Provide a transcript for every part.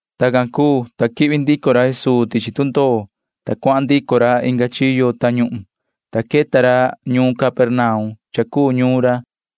Tacan cuu, ta quihvi ndico ra Jesuu tichi tundoo, ta cuahan ndico ra inga chiyo tañuhun can, ta queta ra ñuun Capernaum cha cuu ñuun ra.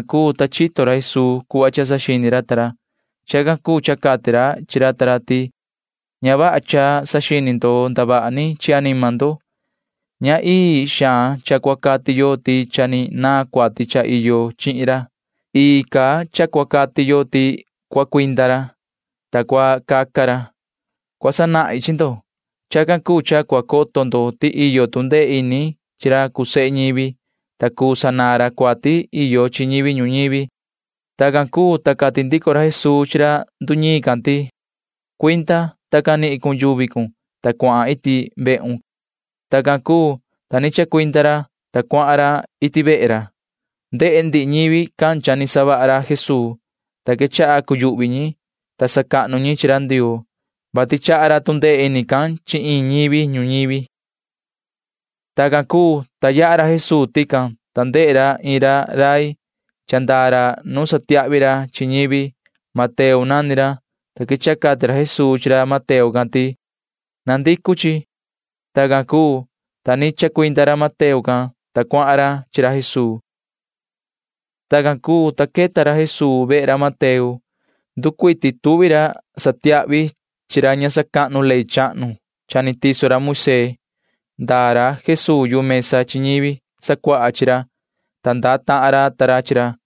Tacan, ta chito ra Jesuu yoso cuhva saxini ra ta ra. Chacan cuu cha cati ra chi ra ta ra ti: ―Ña vaha cha saxini ndo ndavaha ni chi anima ndo. Ña ii xaan cha cua cati yo ti cha ni naan cuati cha iyo chihin ra. Ii ca cua cati yo ti cua cuinda ra, ta cua caca ra. Cua sanahin chi ndo. Chacan cuu cha cua coto ndo ti iyo tu ndee ini chi ra cuu sehe ñivi, ta cuu sanaan ra cuati iyo chi ñivi ñuñivi ―cati ra Jesuu chi ra ta ra. Tacan cuu, ta cati ra Jesuu chi ra nduñiin can ti: ―Cuinda, ta canihin cun yuvi cun, ta cuahan iti vehun ―cati ra. Tacan cuu, ta ni chacuinda ra, ta cuahan ra iti vehe ra. Ndehe ndihi ñivi can cha ni savaha ra Jesuu, ta quechaha cuyuhvi ñi. Sacahnu ñi chi ra Ndioo, vati chaha ra tu ndee ini can chi iin ñivi ñuñivi. Tacan cuu, ta yaha ra Jesuu tican, ta ndehe ra iin rai, ta ndaa ra nu satiahvi ra chi ñivi. Mateo nani ra, ta quechaha cati ra Jesuu chi ra Mateo can ti: ―Na coho. Tacan cuu, ta ni chacuinda ra Mateo can, ta cuahan ra chi ra Jesuu. Tacan cuu, ta queta ra Jesuu vehe ra Mateo. Nducuiti tuvi ra satiahvi chi ra ña sacahnu ley chahnu cha ni tiso ra Moisee. Ndaa ra Jesuu yu mesa chi ñivi sacuaha chi ra, ta ndaa tahan ra ta ra chi ra.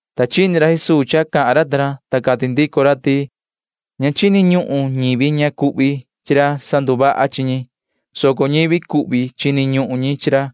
Ta chini ra Jesuu cha cahan ra ta ra, ta cati ndico ra ti: ―Ña chini ñuhun ñivi ña cuhvi chi ra sanduvaha chi ñi, soco ñivi cuhvi cuu ñi chini ñuhun chi ra.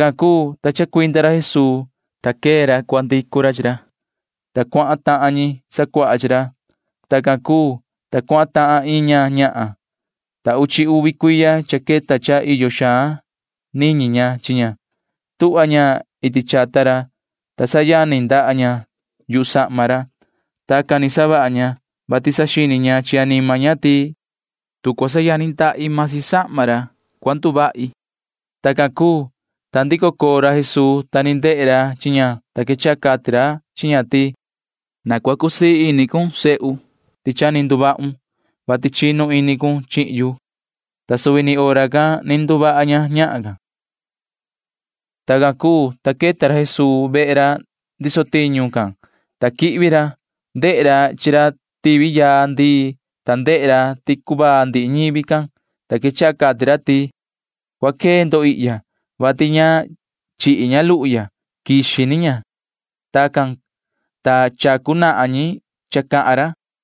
Tacan cuu, ta chacuinda ra Jesuu, ta quee ra cua ndicu ra chi ra, ta cuahan tahan ñi sacuaha chi ra. Tacan cuu, ta cuahan tahan iin ñahan. Cha queta uchi uvi cuiya cha iyo xaan niñi ña chi ña. Tuhva ña iti chata ra, ta sayani ndaha ña yu sahma ra. Tacan ni savaha ña, vati saxini ña chi anima ña ti tu cua sayani ndaha ña―masi sahma ra, cua nduvaha ña, saxini ña. Tacan cuu, ta chico coo ra Jesuu, ta ni ndehe ra chi ña, ta quechaha cati ra chi ña ti: ―Yoho sihi, na cua cusii ini cun. Cha ni nduvahun, vati chinu ini cun chihin yu ―cati ra. Ta suvi ni hora can ni nduvaha ña ñahan can. Tacan cuu, ta queta ra Jesuu vehe ra ndiso tiñu can, ta quihvi ra. Ndehe ra chi ra tivi yaa ndii, ta ndehe ra ti cuvaa ndihi ñivi can, ta quechaha cati ra ti: ―Cua quee ndo, vati ña chihi ña luhu ya. Quixi ni ña ―cati ra chi ñi. Tacan, ta chacu nahan ñi cha cahan ra.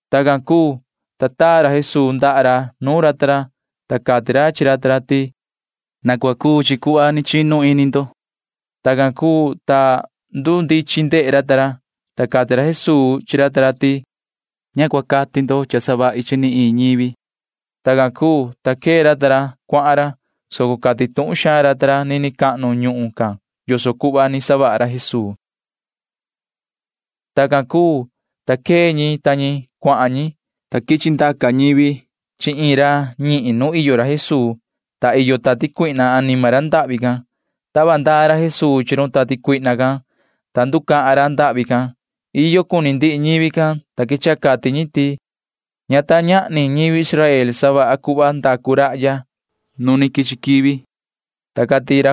Tacan cuu, ta taa ra Jesuu ndaha ra nuun ra ta ra, ta cati ra chi ra ta ra ti: ―Na cua cuu chi cuhva ni chinu ini ndo. Tacan cuu, ta ndundichin vaha ndehe ra ta ra, ta cati tuhun xaan ra Jesuu chi ra ta ra ti: ―Ña cua cahan ndo ni chi iin ñivi. Tacan cuu, ta quee ra ta ra cuahan ra, soco cati tuhun xaan ra ta ra nini cahnu ñuhun can yoso cuhva ni savaha ra Jesuu. Tacan cuu, ta quee ñi ta ñi cuahan ñi, ta quichi ndaca ñivi chi iin ra ñihin nu iyo ra Jesuu, ta iyo tati cuihna anima ra ndahvi can. Tava ndaa ra Jesuu chi maan run tati cuihna can, ta nducahan ra ndahvi can. Iyo cuni ndihi ñivi can, ta quechaha cati ñi ti: ―Ña ta ñahni ñivi Israel ndehe cuhva savaha rahya [nu ni quichi quivi] ―cati ñi.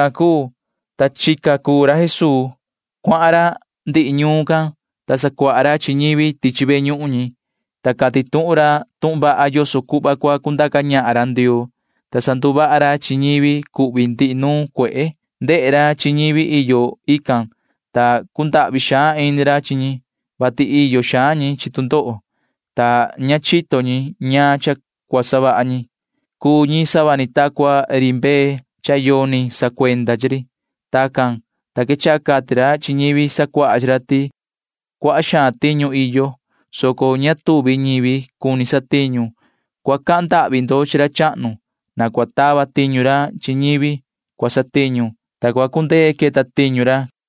Tacan cuu, ta chica cuu ra Jesuu. Cuahan ra ndihi ñuun can, ta sacuaha ra chi ñivi tichi ve ñuhun ñi, ta cati tuhun ra tuhun vaha yoso cuhva cua cundaca ñahan ra Ndioo, ta sanduvaha ra chi ñivi cuhvi chi ndihi nuun cuehe can. Ndehe ra chi ñivi iyo ican, ta cundahvi xaan ini ra chi ñi, vati iyo xaan ñi chi tu ndoho, ta ña chito ñi ñaan cha cua savaha ñi. Cha cuu ñi sava ni ta cua ri mbee, ta yoni ra sacuenda chi ri. Tacan, ta quechaha cati ra chi ñivi sacuaha chi ra ti: ―Cuaha xaan tiñu iyo, soco ña queta ñivi cua satiñu. Cua cahan ndahvi ndo chi ra chahnu ti na cua tava tiñu ra chi ñivi cua satiñu, ta cua cundee queta tiñu ra ―cati ra Jesuu.